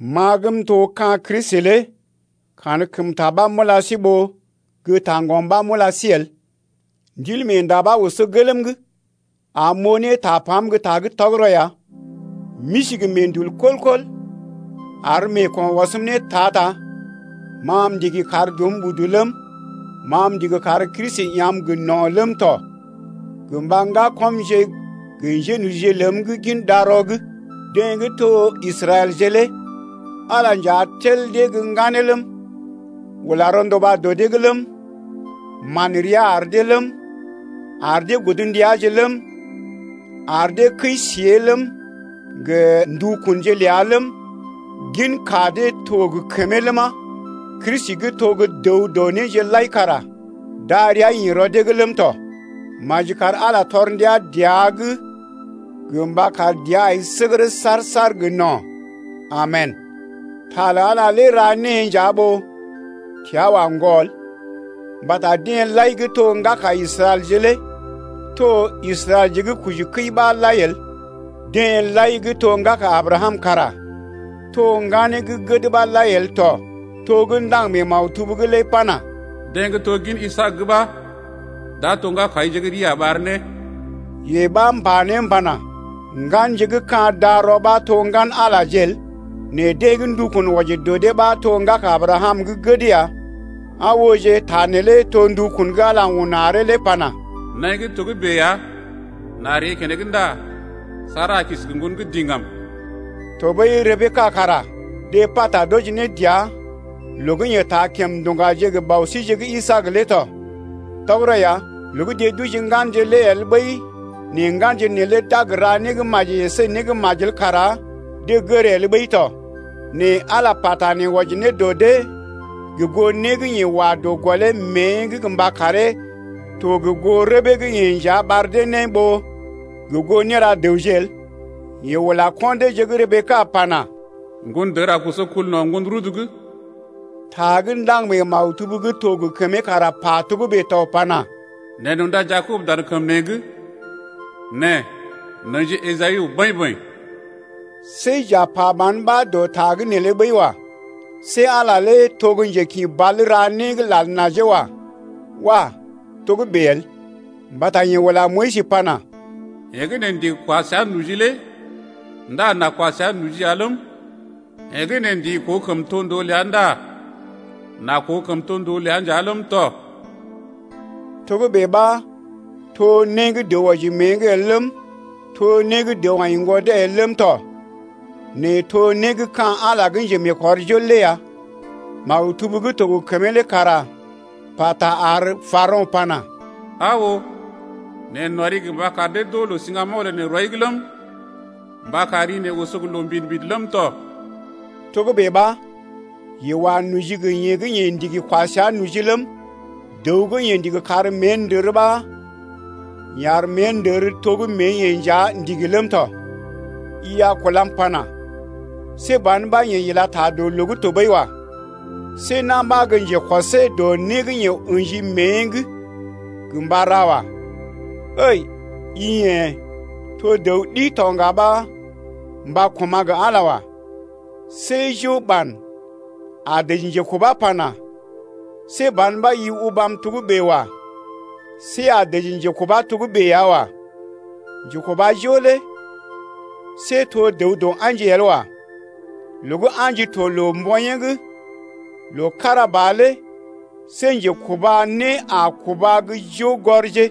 Ma gə́ m’to ka̰ Kristi lé kankəmta ɓa m’ula sí ɓó gə́ taŋgɔm ɓa m’ula sí el. Ndilmeenda ɓa oso gelm’g am m’oo ne tapam gə́ ta gə́ tɔgərɔ ya. M’isi gə meḛdul kɔl-kɔl ar meeko̰ ɔsm ne ta-ta. Ma m’ndigi kar dɔm udu ləm, ma m’ndigi kar Kristi ya̰’m gə no̰ ləm tɔ gə mba ŋgakɔmje gə njénojije ləm gə́ gin darɔ’g, deḛ gə́ to Israɛlje lé. Ala nja tel dee gə́ ŋganeeje ləm, ula rɔnduba dɔ dee’g ləm, man rəa ar dee ləm, ar dee godndiaje ləm, ar dee kəi-siée ləm, gə ndukunje ləa ləm, ginka deḛ gə́ to gə kəmee ləma, Kristi gə́ to gə́ dəw dɔ néje lai kara darəa ḭ rɔ dee’g ləm tɔ. Maji kar Ala tɔr ndia dəa’g gə mba kar dəa ai səgərə saar-saar gə no̰. Amen. Ta lə Ala lé ra née nja ɓó təa wa ŋgɔ el. Mbata deḛ lai gə́ to gə́ ŋgaka Israɛlje lé to Israɛlje gə́ kojikəi ɓa lai el. Deḛ lai gə́ to gə́ ŋgaka Abrakam kara to ŋganeeje gə́ gəd ɓa lai el tɔ. To gə́ ndaŋg mee maktub’g lé pana: Deḛ gə́ to gin Isaak’g ɓa d’a to ŋgakaije gə́ rii a ɓar ne. Yee ɓa, m’pa ne m’pana: Ŋganje gə́ ka̰ darɔ ɓa to ŋgan-Alaje el, nɛ deḛ gə́ ndukun wɔji dɔ dee ɓa to ŋgaka Abrakam gə́ gəd ya. Aa ooje, ta neelé to ndukun gə́ Ala un aree lé pana: Naḭ gə́ togə́bè ya, n’a ree keneŋ ndá Sara a kisi gə ŋgon gə́ diŋgam. Tɔɓəi Rebeka kara deḛ pata d’wɔji ne dəa loo gə́ yeḛ taa kèm nduŋgaje gə bɔ síje gə́ Isaak lé tɔ. Tɔgərɔ ya, loo gə́ deḛ d’oji ŋganje lé el ɓəi nɛ ŋganje neelé d’a gə ra né gə́ maji əsé né gə́ majel kara deḛ gər el ɓəi tɔ. Nɛ Ala pata nee wɔji ne dɔ dee gə goo né gə́ yeḛ wa dɔ gɔlee mée’g mba karee to gə goo rəbee gə́ yeḛ nja ɓar dee ne ɓó gə goo néra dəwje el. Yeḛ ula ko̰ deeje gə́ Rebeka pana: Ŋgondər a koso kul no̰ ŋgon rudu’g. Ta gə́ ndaŋg mee maktub gə́ to gə kəmee kara pa togə́bè to pana: Neḛ n’unda Jakob dan kəm neḛ’g, Nɛ n’ə̰ji Esawu bəḭ-bəḭ. See j’a pa ban ɓa dɔ ta’g neelé ɓəi wa. See Ala lé to gə́ njekḭbal ɓa ra né gə́ lal najee wa. Wah! togə́bè el. Mbata yeḛ ula Moyis pana: Yeḛ gə́ neḛ ndigi kwa səa noji lé ndá n’a kwa səa noji ləm, yeḛ gə́ neḛ ndigi koo kəmtondoo ləa ndá n’a koo kəmtondoo ləa nja ləm tɔ. Togə́bè ɓa to né gə́ dəw wɔji mée’g el ləm, to né gə́ dəw aḭ ŋgwɔdee el ləm tɔ nɛ to né gə́ ka̰ Ala gə́ njemeekɔrjol lé ya. Maktub gə́ to gə kəmee lé kara pata ar Parao̰ pana: Aa oo, neḛ n’ɔri gə mba kar dee d’oo loo siŋgamoŋ lə neḛ rɔi’g ləm, mba kar ri neḛ oso gə loo mbidi-mbidi ləm tɔ. Togə́bè ɓa, yeḛ wa noji gə yeḛ gə́ yeḛ ndigi kwa səa noji ləm, dəw gə́ yeḛ ndigi kar mée ndər ɓa yeḛ ar mée ndər to gə́ mée-yeḛ nja ndigi ləm tɔ. I a kulam pana: See ban ɓa yeḛ ila ta loo’g tɔɓəi wa. See na̰ ɓa gə njekɔsee dɔ né gə́ yeḛ ə̰ji mée’g gə mba ra wa. Ǝi i yḛ̀ to dəw ɗi to ŋga ɓa mba koma̰ gə Ala wa. See jo ɓan a dəji njekubá pana: See ban ɓa i ubam togə́bè wa. See a dəji njekubá togə́bè ya wa. Njekubajo lé see to dəw dɔ a̰ji el wa. Loo gə́ a̰ji to loo-mboḭyee’g loo kára ba lé see njekuba né a kuba gə́ joo gɔrje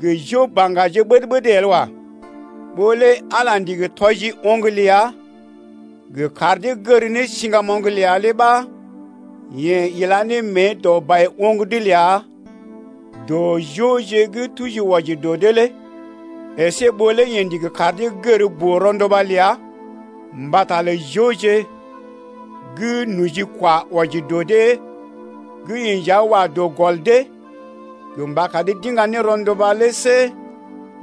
gə jo baŋgaje ɓəd-ɓəd el wa. Ɓó lé Ala ndigi tɔji oŋg ləa gə kar dee gər ne siŋgamoŋ ləa lé ɓa yeḛ ila ne mée dɔ bai-oŋg’d ləa dɔ joje gə́ tuji wɔji dee lé əsé ɓó lé yeḛ ndigi kar dee gər boo-ronduba ləa mbata lə joje gə́ nojikwa wɔji dɔ deḛ gə́ yeḛ nja wa dɔ gɔl dee gə mba kar dee d’iŋga ne rɔnduba lé see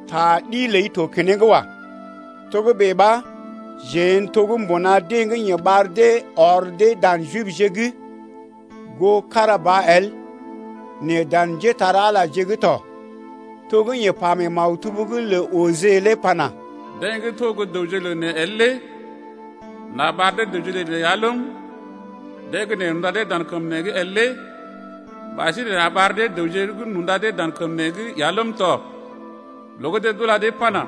ta ɗi ləi to keneŋ wa. Togə́bè ɓa jeḛ n’to mbuna deḛ gə́ yeḛ ɓar dee ɔr dee dan Jibje’g goo kára ba el nɛ dan njépole-magəje’g tɔ to gə́ yeḛ pa mee maktub’g lə Ojee lé pana: Deḛ gə́ to gə́ dəwje lə neḛ el lé N’a ɓar dee dəwje lə neḛ ya ləm, Deḛ gə́ neḛ n’unda dee dan kəm neḛ’g el lé Ɓasinè n’a ɓar dee dəwje gə́ n’unda dee dan kəm neḛ’g ya ləm tɔ. Loo gə́ deḛ d’ula dee pana: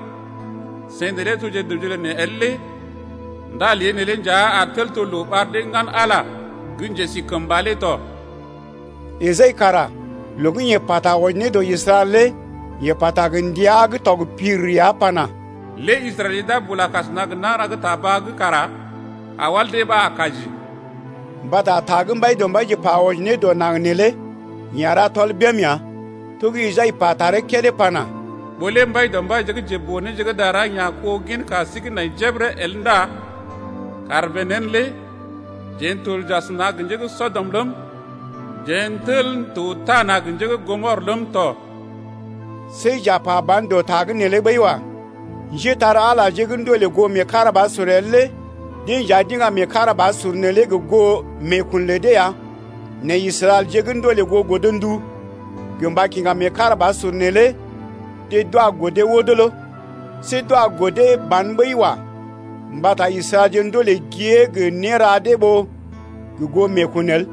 Seḭ neelé toje dəwje lə neḛ el lé Ndá lée neelé nja a tel to loo ɓar dee ŋgan Ala gə́ njesikəmba lé tɔ. Esai kara loo gə́ yeḛ pata wɔji ne dɔ Israɛl lé yeḛ pata gə ndia gə́ tɔg pir ya pana: Lé Israɛlje d’a bula kasəna gə nagəra gə́ ta baa’g kara kawal dee ɓa a kaji ya. Mbata ta gə́ Mbaidɔmbaije pa wɔji ne dɔ naŋg neelé yeḛ a ra tɔl bém ya. To gə́ Esai pa taree kédé pana: Ɓó lé Mbaidɔmbaije gə́ njeboo-néje gə́ dara ya̰ kó ginka sí gə́ nai jebəre el Ndá kàr bèe nḛ lé jeḛ n’tel j’asəna gə njé gə́ Sɔdɔm ləm, Jeḛ n’tel n’to tana gə njé gə́ Gɔmɔr ləm tɔ. See j’a pa ban dɔ ta’g neelé ɓəi wa. Njétar-Alaje gə́ ndolè goo meekarabasur el lé deḛ nja d’iŋga meekarabasur neelé gə goo meekun lə dee ya, nɛ Israɛlje gə́ ndolè goo godndu gə mba kiŋga meekarabasur neelé deḛ d’wa godee wodolo. See d’wa godee ban ɓəi wa. Mbata Israɛlje ndolè gée gə néra dee ɓó gə goo meekun el.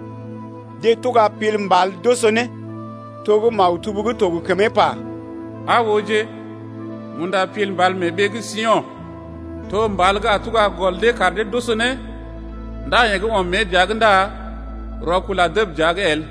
Deḛ tuga pil mbal d’oso ne to gə́ maktub gə́ to gə kəmee pa lé: Aa ooje, m’unda pil mbal mee ɓee gə́ Sio̰, To mbal gə́ a tuga gɔl dee kar dee d’oso ne Ndá yeḛ gə́ ɔm mée dəa’g ndá rɔkul a dəb dəa’g el.